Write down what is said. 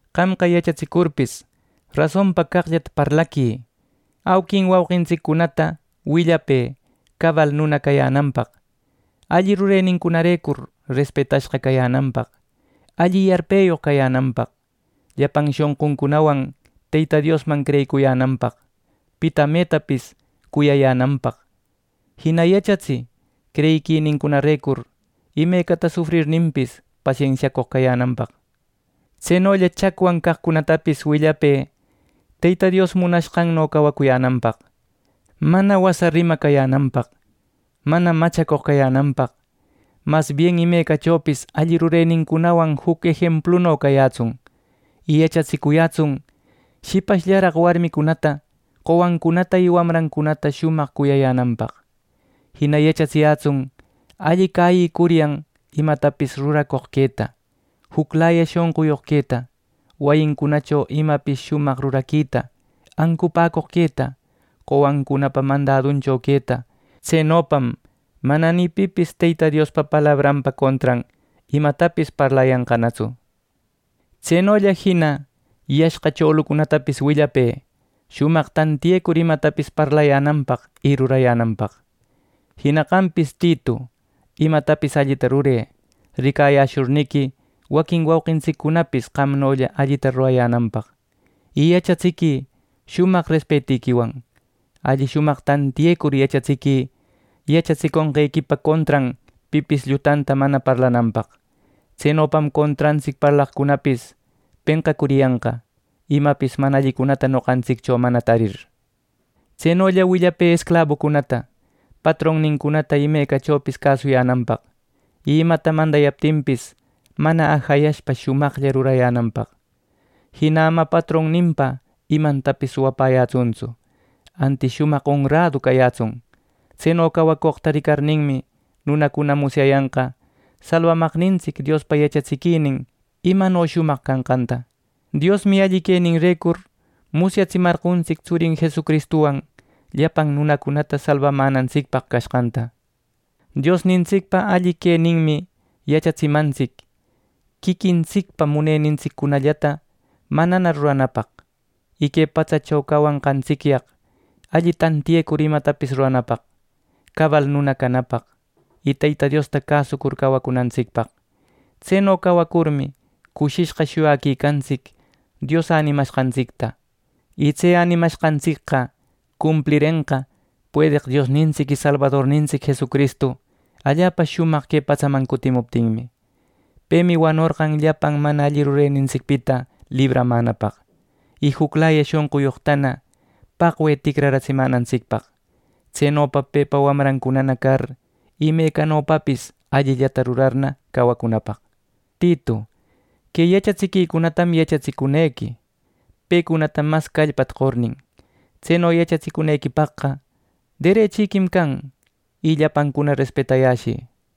Qamqa yachatsicurpis, rasonpa caqllata parlaquï. Auquin wauqintsiccunata willapë cabal nuna cayänanpaq, alli rurenincunarecur respetashqa cayänanpaq, alli yarpeyoq cayänanpaq, llapan shonquncunawan Teyta Diosman creyicuyänanpaq, pita metapis cuyayänanpaq. Jina yachatsï creyiquinincunarecur imecata sufrirninpis, pasensiacoq cayänanpaq. Tsenolla chacwan caqcunatapis willapë Teyta Dios munashqanno cawacuyänanpaq, mana wasa rima cayänanpaq, mana machacoq cayänanpaq. Masbien imecachopis alli rurenincunawan juc ejempluno cayätsun. Y yachatsiyätsun shipashllaraq warmicunata, qowancunata y wawancunata shumaq cuyayänanpaq. Jina yachatsiyätsun alli cäyïcuryan imatapis ruracoq queta, juclaya shonquyoq queta, wayincunacho imapis shumaq ruraquita, ancupäcoq queta, qowancunapa mandaduncho queta. Tsenopam mana ni pipis Teyta Diospa palabranpa contran imatapis parlayanqanatsu. Tsenolla jina yashqa cholucunatapis willapë shumaq tantiyecur imatapis parlayänanpaq y rurayänanpaq. Jina qampis, Titu, imatapis allita rurë, ricayäshurniqui waquin wauqintsiccunapis qamnolla allita rurayänanpaq, y yachatsiquï shumaq respetiquiwan. Alli shumaq tantiyecur yachatsiquï yachatsiconqequipa contran pipis llutata mana parlananpaq. Tsenopam contrantsic parlaqcunapis penqacuriyanqa, imapis mana allicunata noqantsiccho mana tarir. Tsenolla willapë esclabucunata patronnincunata imecachopis cäsuyänanpaq, y imata mandayaptinpis mana ajayashpa shumaqlla rurayänanpaq. Jina ama patronninpa imantapis suwapäyätsuntsu; antis shumaq onradu cayätsun. Tseno cawacoqta ricarninmi, nunacuna musyayanqa salbamaqnintsic Diospa yachatsiquinin imano shumaq cashqanta. Diosmi alli queninrecur musyatsimarqontsic tsurin Jesucristuwan llapan nunacunata salbamänantsicpaq cashqanta. Diosnintsicpa alli queninmi yachatsimantsic quiquintsicpa munenintsiccunallata manana ruranapaq; y que patsacho cawashqantsicyaq alli tantiyecur imatapis ruranapaq, cabal nuna canapaq, y Teyta Diosta cäsucur cawacunantsicpaq. Tseno cawacurmi cushishqa shuyaquicantsic Dios änimashqantsicta. Y tse änimashqantsicqa cumplirenqa puedeq Diosnintsic y Salbadornintsic Jesucristu allapa shumaq que patsaman cutimuptinmi. Pemi wanorqan llapan mana alli rurenintsicpita libramänapaq, y juclaya shonquyoqtana paqwe ticratsimänantsicpaq; tsenopa pepa wamrancunana car imecanopapis allillata rurarna cawacunapaq. Titu, que yachatsiquicunatam yachatsicunequi, pecunata mas callpata qornin. Tseno yachatsicunequipaqqa derechiquim can, y llapancuna respetayäshï.